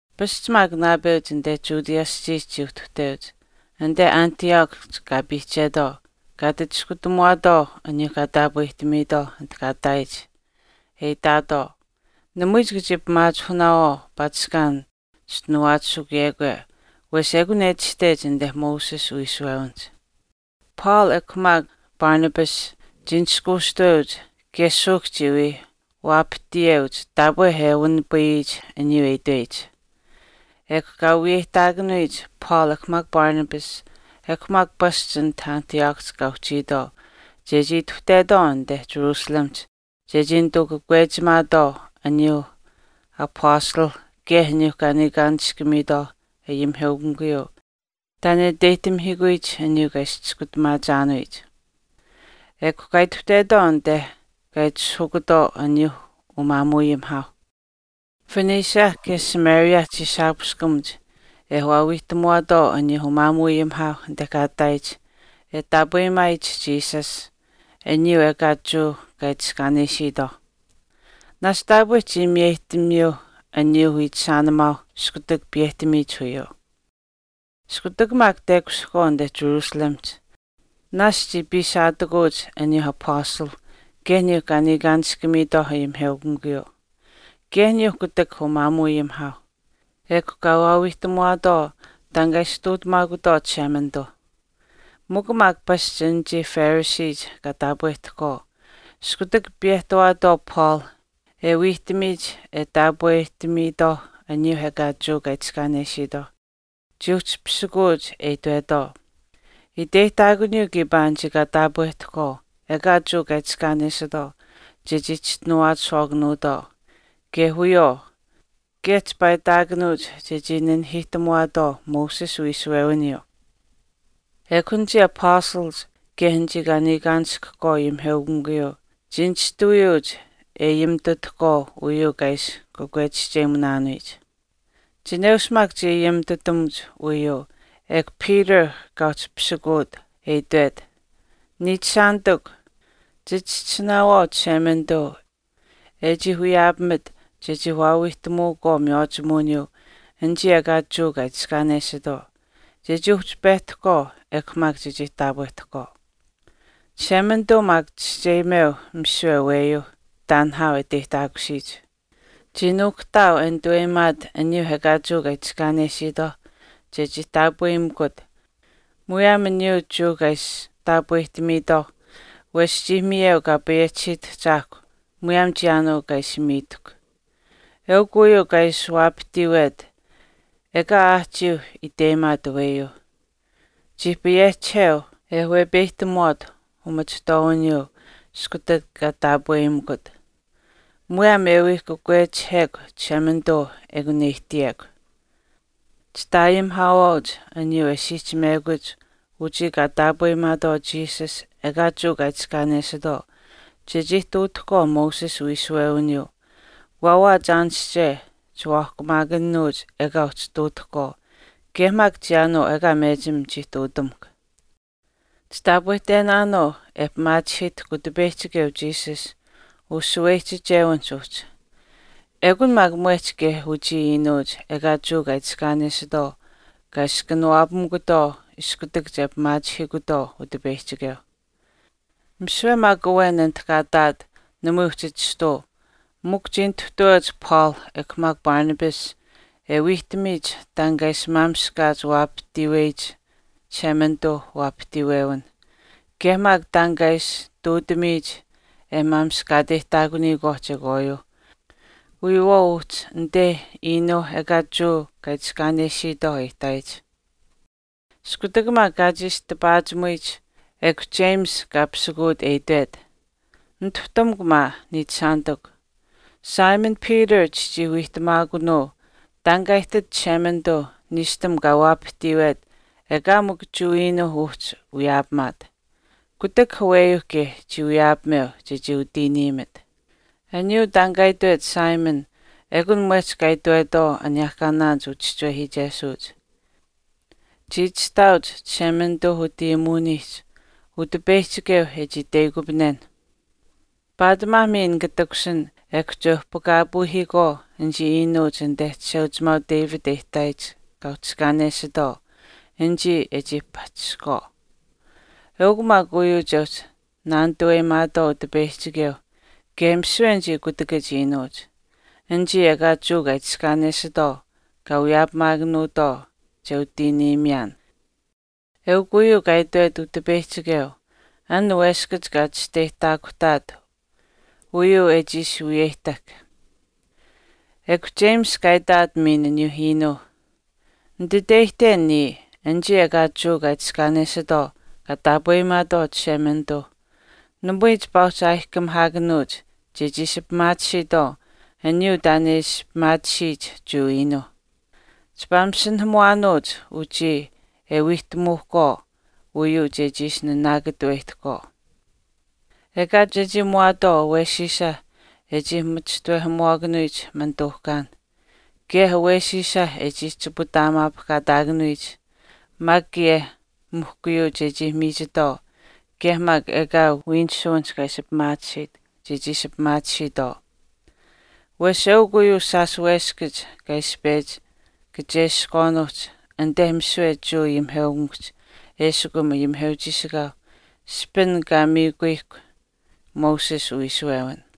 Pasch maak naapeuch anite Judea aschiihch chii uhtuhteuch anite Antiochihch kaa piihchetwaau kaa ati chischinuhamuwaatwaau aniyuuh kaa taapwehtamiitwaau anit kaa ihtaayich, e itaatwaau, “Namui chika chii pimaachihunaawaau paatishkaan chischinuwaachishukuyekwe wesh ekun e itashtech anite Moses uwiishuwewinihch.” Paul ekw maak Barnabas chii nishkuushtuweuch kaye suuhk chii wii waapahtiyeuch taapwe e wanipayiyich aniyuu e itweyich. Ekw kaa wiyeyihtaakanuyich Paul ekw maak Barnabas ekw maak pasch anit Antiochihch kaa uhchiitwaau chechii ituhtetwaau anite Jerusalemihch chechii nituu kakwechimaatwaau aniyuu apastalh kaye aniyuu kaa niikaanishkamiitwaauh ayimiheukamikuyuu taan e iteyihtamihiikuyich aniyuu kaa ishi chiskutamaachaanuyich. Ekw kaa ituhtetwaau anite kaa itishahukutwaau aniyuu umaamuuayimihaau. Phoenicia kaye Samaria chii shaapuweshkamuch e waawiihtamuwaatwaau aniyuu umaamuuayimihaau anite kaa ihtaayich e taapweyimaayich Jesus aniyuu ekaa Jewa kaa itiskaanesitwaau. Naashch taapwe chii miyeyihtamiyuu aniyuuh wiichishaanimaauh iskutak piyehtamiyich uyuu. Iskutak maak tekushihkwaau anite Jerusalemihch, naasch chii piisaatakuuch aniyuu apastalh kaye aniyuu kaa niikaanishkamiitwaau ayimiheukamikuyuu, kaye aniyuu kutak umaamuuayimihaau, ekw kaa waawiihtamuwaatwaau taan kaa ishi ihtuutamaakutwaau Chishemanituu. Mikw maak, pasch anichii Phariseech kaa taapwehtahkwaau, iskutak piyehtawaatwaau Paul e wiihtamiyich e taapwehtamiitwaauh aniyuu ekaa Jewa kaa itiskaanesiitwaauh, chii uhchi pisikuuch e itwetwaau, “Iteyihtaakuniyuu kiipaa anichii kaa taapwehtahkwaau ekaa Jewa kaa itiskaanesitwaau chechii chischinuwaachishwaakanuutwaau kaye wiyawaau kaye chipaa itaakanuuch chechii nanihiihtamuwaatwaau Moses uwiishuwewiniyuu.” Ekw anichii apastalach kaye anichii kaa niikaanishkahkwaau ayimiheukamikuyuu chii nishtuwiyuuch e ayimitutahkwaau uyuu kaa ishi kakwechischeyimunaanuyich. Chineush maak chii ayimitutamuch uyuu ekw Peter kaa uhchi pisikuut e itwet, “Niichishaanitikw, chichischisinaawaau Chishemanituu e chii wiyaapamit chechii waawiihtamuukwaau miywaachimuwiniyuu anichii ekaa Jewa kaa itiskaanesitwaau, chechii uhchi pehtahkwaau ekw maak chechii taapwehtahkwaau. Chishemanituu maak chischeyimeu misiwe aweyuu taan nihaau e iteyihtaakusiyich. Chii nuukuhtaau e nituweyimaat aniyuu ekaa Jewa kaa itiskaanesiitwaauh chechii taapweyimikut muyaam aniyuu Jewa kaa ishi taapwehtamiitwaauh wesh chii miyeu Kaa payehchisiyich Ahchaahkwa muyaam chiyaanuu kaa ishi miitahkw. Eukw uyuu kaa ishi waapahtiiwet ekaa aahchiiuh iteyimaat aweyuuh. Chii payehchiheu e wepeyihtamuwaat umachihtwaawiniyuu iskutak kaa taapweyimikut. Muyaam e wii kakwechihekw Chishemanituu ekun e ihtiyekw. Chitaayimihaawaauch aniyuu e siihchimekuch uchii kaa taapweyimaatwaau Jesus ekaa Jewa kaa itiskaanesitwaau chechii ihtuutahkwaau Moses uwiishuwewiniyuu waawaach aanische chiwaahkumaakanuuch ekaa uhchii ihtuutahkwaau kaye maak chiyaanuu ekaa mechim chii ihtuutamuhkw. Chitaapwehtenaanuu e pimaachihiitahkw Utipeyihchikeu Jesus ushaweyihchichewinihch uhchi. Ekun maak mwehch kaye uchii iinuuch ekaa Jewa kaa itiskaanesitwaau kaa ishi kanawaapamikutwaau iskutak che pimaachihiikutwaau Utipeyihchikeu.” Misiwe maak awen anit kaa ihtaat namui uhchi chistuu mikw chii nituhtaweuch Paul ekw maak Barnabas e wiihtamiyich taan kaa ishi maamishkaach waapahtiiweyich Chishemanituuh waapahtiiwewinh, kaye maak taan kaa ishi ihtuutamiyich e maamishkaateyihtaakuniyikwaauh chekwaayuuh wiyawaau uhchi anite iinuu ekaa Jewa kaa itiskaanesiitwaauh e ihtaayich. Iskutak maak kaa chiishi tipaachimuyich, ekw James kaa pisikuut e itwet, “Nituhtamukw maa, niichishaanitikw, Simon Peter chichii wiihtamaakunuu taan kaa ihtit Chishemanituu niishtam kaa waapahtiiwet ekaa mikw Jewa iinuuh uhchi wiyaapamaat, kutak aweyuu kaye chii wiyaapameu chechii utiiniimit. Aniyuu taan kaa itwet Simon, ekun mwehch kaa itwetwaau aniyehkaanaanich uchischiwehiichesuuch. Chii itashtaauch Chishemanituu utayimuwinihch Utipeyihchikeu e chii itweyikupanenh, paatimaa miin nika takushin ekw che uhpakaapuuhiikwaau anichii iinuuch anite Chisheuchimaau David e ihtaayich kaa uhchiskaanesitwaau anichii e chii pahchishinitwaau. Eukw maak uyuu che uhchi naanituweyimaatwaau Utipeyihchikeu kaye misiwe anichii kutakach iinuuch, anichii ekaa Jewa kaa itiskaanesitwaau kaa wiyaapamakwaau che utiiniimiyaan, eukw uyuu kaa itwet Utipeyihchikeu an weskach kaa chischeyihtaakuhtaat uyuu e chii ishi wiyeyihtahk.” Ekw James kaa itaat miin aniyuu iinuu, “Nititeyihten niya anichii ekaa Jewa kaa itiskaanesitwaau kaa taapweyimaatwaau Chishemanituu, namui chipaa uhchi aayihkamihaakanuuch chechii ishi pimaatisiitwaau aniyuu taan e ishi pimaatisiyich Jewa iinuuh. Chipaa masinahamuwaanuuch uchii e wiihtamuuhkwaau uyuu chechii ishi naanaakatuweyihtahkwaau. Ekaa chechii muwaatwaau awesiisa e chii machishtawehamuwaakanuyich manituuhkaan, kaye awesiisa e chii chiputaamaapahkaataakanuyich maak kaye mihkuyuu chechii miichitwaau kaye maak ekaa wiinisuwinich chechii ishi pimaatisiitwaau. Wesh eukw uu shaash weskach kaa ishi pechi kacheskwaanuuhch anite misiwe Jewa ayimiheukamikuhch eshikum ayimiheuchiishikaau ishpin kaa miikuyihkw Moses uwiishuwewin.”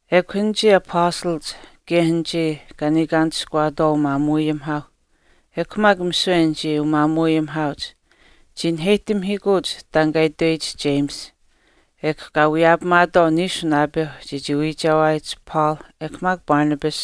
Ekw anichii apastalach kaye anichii kaa niikaanishkuwaatwaau umaamuuayimihaauh ekw maak misiwe anichii umaamuuayimihaauch chii naheyihtamihiikuuch taan kaa itweyich James ekw kaa wiyeyimaatwaau niishu naapeuh chechii wiichewaayich Paul ekw maak Barnabas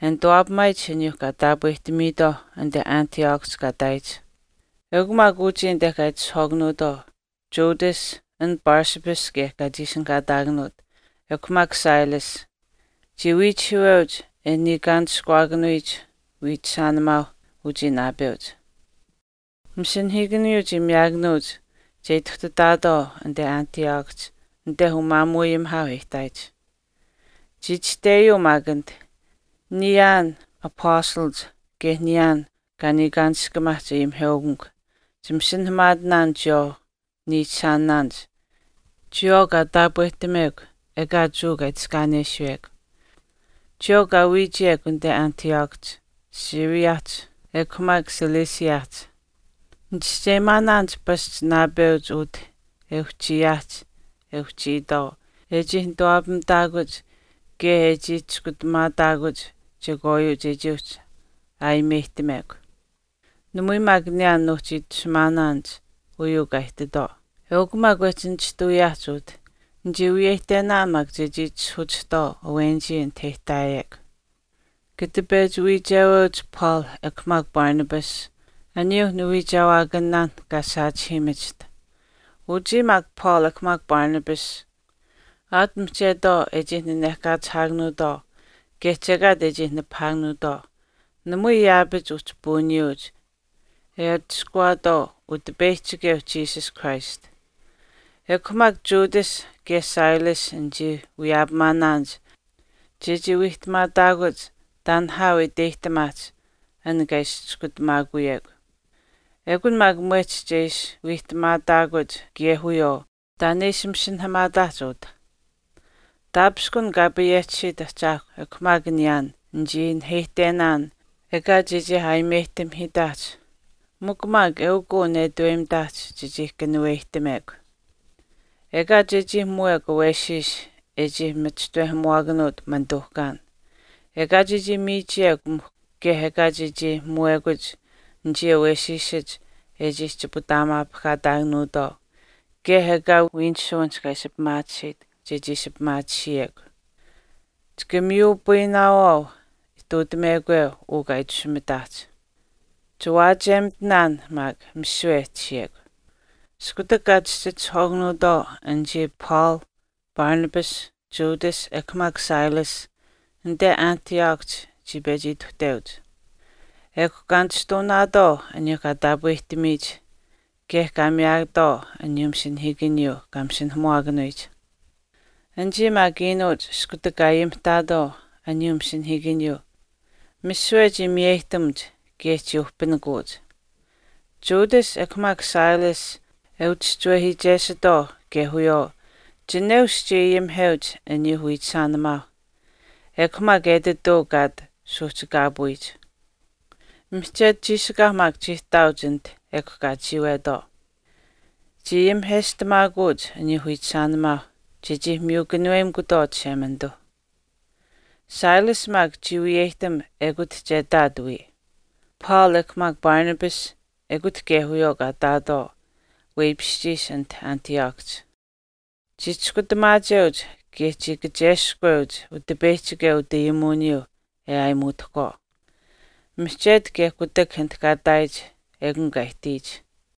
e nituwaapamaayich aniyuu kaa taapwehtamiitwaauh anite Antiochihch kaa ihtaayich. Eukw maak uchii anite kaa itishahwaakanuutwaau, Judas, an Barsabbas kaye kaa chii ishinihkaataakanuut, ekw maak Silas. Chii wiichihiiweuch e niikaanishkuwaakanuyich wiichishaanimaauh uchii naapeuch. Masinahiikaniyuu chii miyaakanuuch che ituhtataatwaau anite Antiochihch anite umaamuuayimihaau e ihtaayich. Chii itashteyuu maak anit, “Niyaan apastalach, kaye niyaan kaa niikaanishkamaahch ayimiheukamikw, chimasinahamaatinaan chiyawaau niichishaanaanich chiyawaau kaa taapwehtamekw ekaa Jewa kaa itiskaanesiyekw, chiyawaau kaa wiichiyekw anite Antiochihch, Syriahch, ekw maak Ciliciahch. Nichischeyimaanaanich pasch naapeuch utah e uhchiyaahch e uhchiitwaau e chii nituwaapamitaakuch kaye e chii chiskutamaataakuch chekwaayuu chechii uhchi aayimeyihtamekw. Namui maak niyaan nuuhchi itashumaanaanich aniyuu kaa ihtitwaau. Eukw maak wehchii nishtuwiyaahch utah, nichii wiyeyihtenaan maak chechii itishahuchihtwaau awenichii anite e ihtaawekw. Kata pechi wiicheweuch Paul ekw maak Barnabas, aniyuuh niwiichewaakanaanh kaa saachihiimachiht. Uchii maak Paul ekw maak Barnabas, aat mihchetwaau e chii nanehkaachihaakanuutwaau kaye chekaat e chii nipahaakanuutwaau, namui yaapach uhchi puuniyuuch e atushkuwaatwaau Utipeyihchikeu Jesus Christ. Ekw maak Judas kaye Silas nichii wiyaapamaanaanich chechii wiihtamaatakuch taan nihaau e iteyihtamaahch an kaa ishi chiskutamaakuyekw. Ekun maak mwehch che ishi wiihtamaataakuch kaye wiyawaau taan e ishi masinahamaataahch utah. Taapishkun Kaa payehchisiit Ahchaahkw ekw maak niyaan nichii naheyihtenaan ekaa chechii aayimeyihtamihiitaahch mikw maak eukw uu netaweyimitaahch chechii kanuweyihtamekw. Ekaa chechii muwekw awesiis e chii machishtawehamuwaakanuut manituuhkaan, ekaa chechii miichiyekw mihkw kaye ekaa chechii muwekuch anichii awesiisach e chii chiputaamaapahkaataakanuutwaau kaye ekaa wiinisuwinich chechii ishi pimaatisiyekw. Chika miyupayinaawaau ihtuutamekwe uu kaa itashumitaahch. Chiwaachiyemitinaan maak misiwe e tashiyekw.” Iskutak kaa chihchitishahwaakanuutwaau anichii Paul, Barnabas, Judas ekw maak Silas, anite Antiochihch chii pechi ituhteuch. Ekw kaa nishtuunaatwaau aniyuu kaa taapwehtamiyich ekw kaa miyaatwaau aniyuu masinahiikaniyuu kaa masinahamuwaakanuyich. Anichii maak iinuuch iskutak kaa ayimihtaatwaau aniyuu masinahiikaniyuu, misiwe chii miyeyihtamuuch kaye chii uhpinikuuch. Judas ekw maak Silas e uchischiwehiichesuutwaau kaye wiyawaau, chineush chii ayimiheuch aniyuu wiichishaanimaauh, ekw maak etituu kaa ati suuhchikaapuyich. Mihchetu chiishikaau maak chii ihtaauch anit ekw kaa chiiwetwaau. Chii ayimiheshtamaakuuch aniyuu wiichishaanimaauh chechii miyu kanuweyimikutwaau Chishemanituuh. Silas maak chii wiyeyihtam ekut che ihtaat wiya. Paul ekw maak Barnabas ekut kaye wiyawaau kaa ihtaatwaau weipishchiish anit Antiochihch. Chii chiskutamaacheuch kaye chii kacheskweuch Utipeyihchikeu utayimuwiniyuu e aayimuutahkwaau. Mihchetu kaye kutak anit kaa ihtaayich ekun kaa ihtiyich.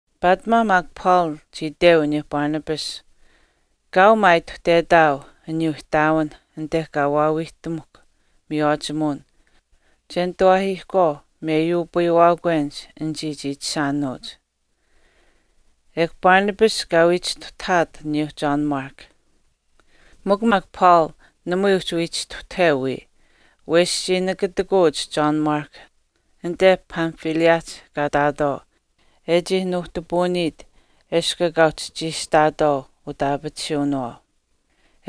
Paatimaa maak Paul chii iteu aniyuu Barnabas, “Kaau maa ituhtetaau aniyuuh ihtaawin anite kaa waawiihtamuhkw miywaachimuwin che nitawaahiikwaau meyuupayiwaakwenich anichii chiichishaanuuch.” Ekw Barnabas kaa wii chistuhtahaat aniyuu John Mark. Mikw maak Paul namui uhchi wii chistuhtaheu wiya, wesh chii nakatikuuch John Mark anite Pamphyliahch kaa ihtaatwaau e chii nuuhtipuuniit eshkw ekaa uhchi chiishihtaatwaau utaapatisuwinawaau.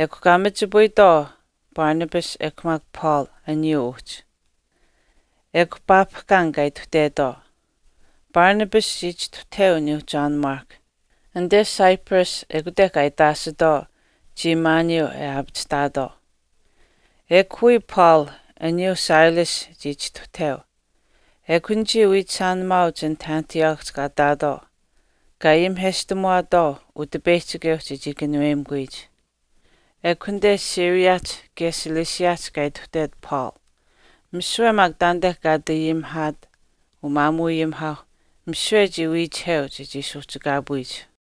Ekw kaa machipayitwaau Barnabas ekw maak Paul uyuu uhchi, ekw paapihkaan kaa ituhtetwaau. Barnabas chii chistuhtaheu aniyuu John Mark, anite Cyprus ekute kaa itaashitwaau chiimaaniyuu e aapachihtaatwaau. Ekw wiya Paul, aniyuu Silas chii chistuhtaheu. Ekw anichii wiichishaanimaauch anit Antiochihch kaa ihtaatwaau kaa ayimiheshtamuwaatwaau Utipeyihchikeu chechii kanuweyimikuyich. Ekw anite Syriahch kaye Ciliciahch kaa ituhtet Paul, misiwe maak taanite kaa ati ayimihaat umaamuuayimihaauh misiwe chii wiichiheu chechii suuhchikaapuyich.